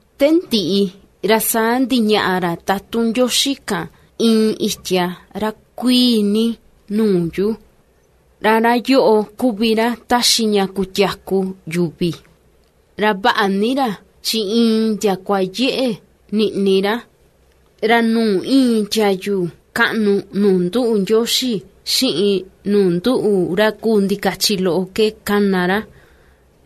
Te ndiꞌi ra saa ndiñaꞌa ra tutun Ndioxi kan iin itia ra kuíí ní nuu yu, ra ra yoꞌo kuvi ra taxi ña kutiaku yuvi. Ra vaꞌa ni ra chi iin ndiakua yeꞌe niꞌni ra, ra nuu íin tiayu kaꞌnu nuu nduꞌu Ndioxi xiꞌin nuu nduꞌu ra kuu ndikachi loꞌo ke kana ra.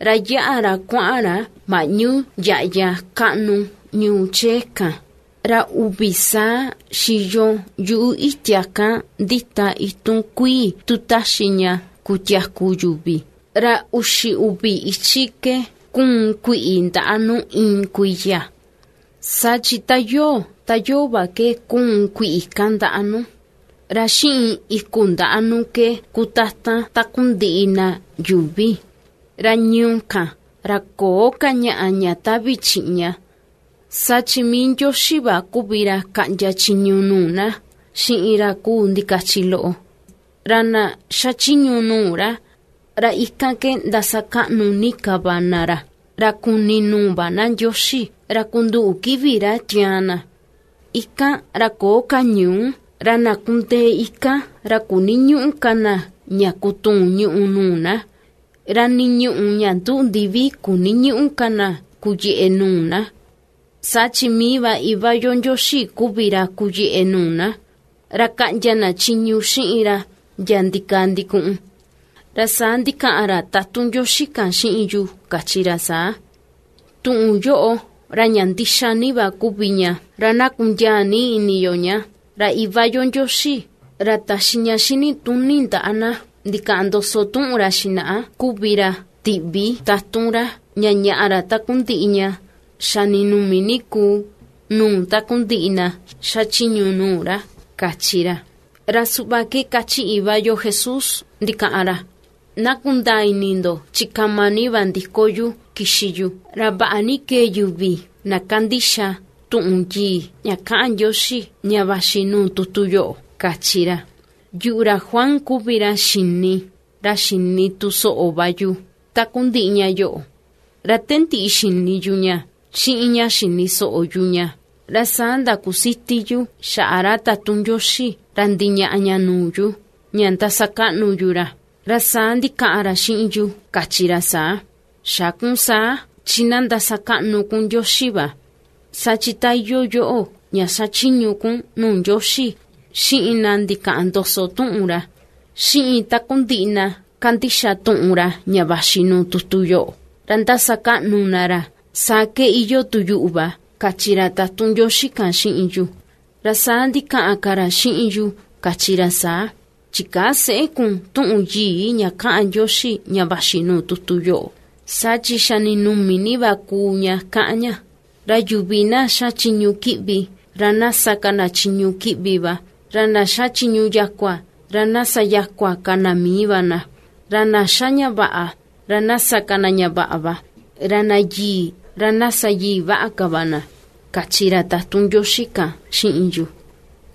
Ra yáꞌa ra kuaꞌan ra maꞌñu yaꞌya kaꞌnu ñuu chee kan, ra uvi saa xiyo yuꞌu itia kan ndita itun kuii tu taxi ña kutiaku yuvi, ra uxi uvi ichi ke ^kuun kuiꞌi ndaꞌa nu iin kuiya, saa chi ta yoo, ta yoo va ke kuun kuiꞌi kan ndaꞌa nu, ra xiꞌin iku ndaꞌa nu ke ^kutatan takundiꞌi na yuuvi. Ra ñuu kan, ra köo ka ñaꞌa ña tavi chiꞌña. Saa chi mii Ndioxi va kuvi ra kaꞌndia chiñu nuu na xiꞌin ra kuu ndikachi loꞌo, ra na ^xachiñu nuu ra, ra ikan ke ndasakaꞌnu ni ka va na ra. Ra kuni nuu va na Ndioxi, ra kunduꞌu kivi ra tiaan na. Ikan ra köo ka ñuú, ra na kundee ikan ra kuniñüꞌu ka na ña kutuun ñùꞌù nuu na, ra nii ñuꞌù ña nduꞌu ndivi kuniñüꞌu ka na kuyeꞌe nuu na, saa chi mii va Iva yo Ndioxi kuvi ra kuyeꞌe nuu na, ra kaꞌndia na chiñu xiꞌin ra ndiaa ndikaa ndikuꞌun. Ra saa ndikaꞌan ra tatun Ndioxi kan xiꞌin yu kachi ra saa: ―Tuꞌun yoꞌo ra ña ndixa ní va kuvi ña, ra na kundiaa ní ini yo ña. Ra Iva yo Ndioxi, ra taxi ña xinituni ndaꞌa na ndikaꞌan ndoso tuꞌun ra xinaꞌa kuvi ra tiꞌvi tatun ra, ña ña̱ꞌa̱ ra takundiꞌi ña xa ndinumi ni kuu nuu takundiꞌi na xachiñu nuu ra ―kachi ra. Ra suꞌva ke ^kachi Iva yo Jesús ndikaꞌan ra: ―¡Na kundaa ini ndo chi kama ni va ndiko yu kixi yu! ¡Ra vaꞌa ni va kee yuvi na ^kandixa tuꞌun yii ña kaꞌan Ndioxi, ña vaxi nuu tutu yoꞌo! ―kachi ra. Yuꞌu, ra Juan, kuvi ra xini, ra xini tu soꞌo va yu, takundiꞌi ña yoꞌo, ra te ndiꞌi xini yu ña xiꞌin ña xini soꞌo yu ña, ra saa ndakusiti yu xaꞌa ra tatun Ndioxi ra ndiñaꞌa ña nuu yu, ña ndasakaꞌnu yu ra. Ra saa ndikaꞌan ra xiꞌin yu kachi ra saa: ―Xä kun saa, chi na ndasakaꞌnu kun Ndioxi va; saa chi ta iyoo yoꞌo ña xachiñu kun nuu Ndioxi, xiꞌin na ndikaꞌan ndoso tuꞌun ra, xiꞌin takundiꞌi na ^kandixa tuꞌun ra ña vaxi nuu tutu yoꞌo, ra ndasakaꞌnu na ra, saa ke iyoo tu yuꞌu va ―kachi ra tatun Ndioxi kan xiꞌin yu. Ra saa ndikaꞌan ka ra xiꞌin yu kachi ra saa: ―Chikäa seꞌé kun tuꞌun yii ña kaꞌan Ndioxi ña vaxi nuu tutu yoꞌo, saa chi xa ninumi ni va kuu ña kaꞌan ña. Ra yuvi na ^xa chiñu kiꞌvi, ra na sa ka na chiñu kiꞌvi va, ra na ^xa chiñu yakua, ra na sa yakua ka na mii va na; ra na ^xa ña vaꞌa, ra na sa ka na ña vaꞌa va, ra na yii, ra na sa yii vaꞌa ka va na ―kachi ra tatun Ndioxi kan xiꞌin yu.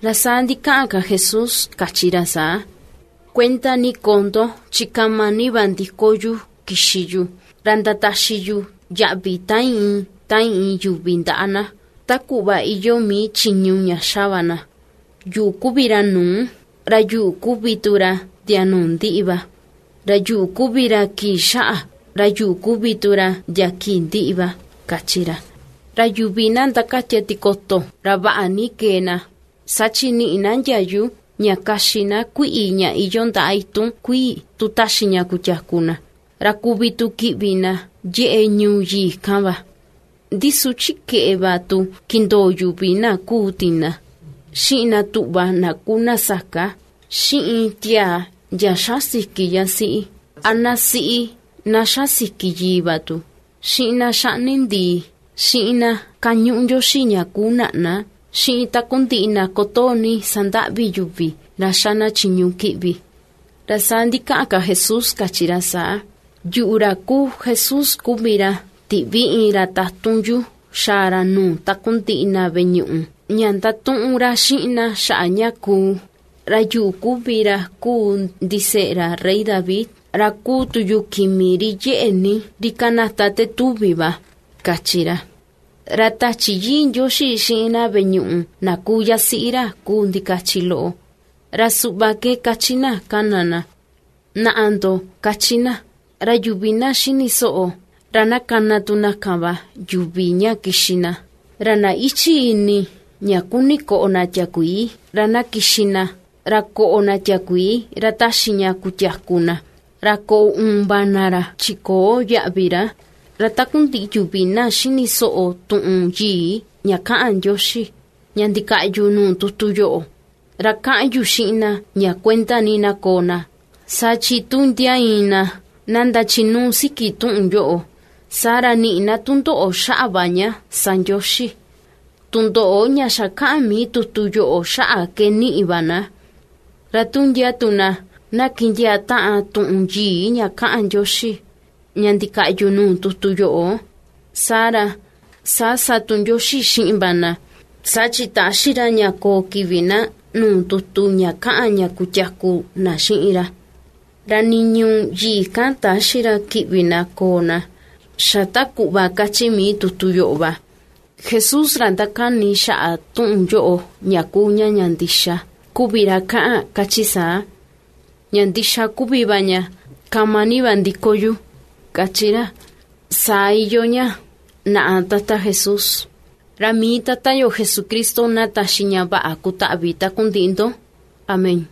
Ra saa ndikaꞌan ka Jesús kachi ra saa: ―Kuenda ni koo ndo chi kama ni va ndiko yu kixi yu, ra ndataxi yu yaꞌvi ta iin ta iin yuvi ndaꞌa na, ta kuꞌva iyoo mii chiñu ña ^xa va na. Yuꞌu kuvi ra nuu, ra yuꞌu kuvi tu ra ndia nuu ndiꞌi va, ra yuꞌu kuvi ra kii xaꞌa, ra yuꞌu kuvi tu ra ndia kii ndiꞌi va ―kachi ra. Ra yuvi na ^ndakatia tikoto, ra vaꞌa ni kee na, saa chi niꞌi na ndiayu ña kaxi na kuiꞌi ña iyoo ndaꞌa itun kuii tu taxi ña kutiaku na, ra kuvi tu kiꞌvi na yeꞌe ñuu yii kan va. Ndi su chi keꞌe va tu kindoo yuvi na kuu tina, xiꞌin na tuꞌva na kuu na saka, xiꞌin tiaa ndia ^xa siki yasiꞌi, a na siꞌi na ^xa siki yii va tu, xiꞌin na xaꞌni ndii, xiꞌin na kañuꞌu ndioxi ña kuu naꞌna, xiꞌin takundiꞌi na kutoo ní sandaꞌvi yuvi ra ^xa na chiñu kiꞌvi. Ra saa ndikaꞌan ka Jesús kachi ra saa: ―Yuꞌu, ra kuu Jesús kuvi ra tiꞌvi iin ra tatun yu xaa ra nuu takundiꞌi na veꞌe ñuꞌu, ña ndatuꞌun ra xiꞌin na xaꞌa ña kuu. Ra yuꞌu kuvi ra kuu ndiseꞌe ra rey David, ra kuu tu yu Kimi ri yeꞌe ní, ri kanata te tuvi va ―kachi ra. Ra Tachi Yii Ndioxi xiꞌin na veꞌe ñuꞌu na kuu yasiꞌi ra kuu ndikachi loꞌo, ra suꞌva ke kachi na kana na: ―Naꞌa ndo ―kachi na. Ra yuvi na ^xini soꞌo, ra na kana tu na kan va yuvi ña kixi na, ra na íchi̱ ini ña kuni koꞌo na tiakuii, ra na kixi na, ra koꞌo na tiakuii ra taxi ña kutiaku na, ra koꞌo uun va na ra, chi köo yaꞌvi ra. Ra takundiꞌi yuvi na ^xini soꞌo tuꞌun yii ña kaꞌan Ndioxi, ña ndikaꞌyu nuu tutu yoꞌo, ra kaꞌan yu xiꞌin na ña kuenda ni na koo na, saa chi tu ndia iin na, na ndachinuu siki tuꞌun yoꞌo, saa ra niꞌi na tundoꞌo xaꞌa va ña sa Ndioxi, tundoꞌo ña xa kaꞌan mii tutu yoꞌo xaꞌa ke niꞌi va na. Ra tu ndia tu na, na kindiaa taꞌan tuꞌun yii ña kaꞌan Ndioxi, ña ndikaꞌyu nuu tutu yoꞌo, saa ra, saa sa tu Ndioxi xiꞌin va na, saa chi täxi ra ña koo kivi na nuu tutu ña kaꞌan ña kutiaku na xiꞌin ra, ra nii ñuu yii kan täxi ra kiꞌvi na koo na, xa ta kuꞌva kachi mii tutu yoꞌo va. Jesús ra ^ndakani xaꞌa tuꞌun yoꞌo, ña kuu ña ña ndixa, kuvi ra kaꞌan kachi saa: ―Ña ndixa kuvi va ña, kama ni va ndiko yu ―kachi ra. Saa iyoo ña. ¡Naꞌa, Tata Jesús! Ra mii Tata yo Jesucristo na taxi ña vaꞌa kutaꞌvi takundiꞌi ndo. Amén.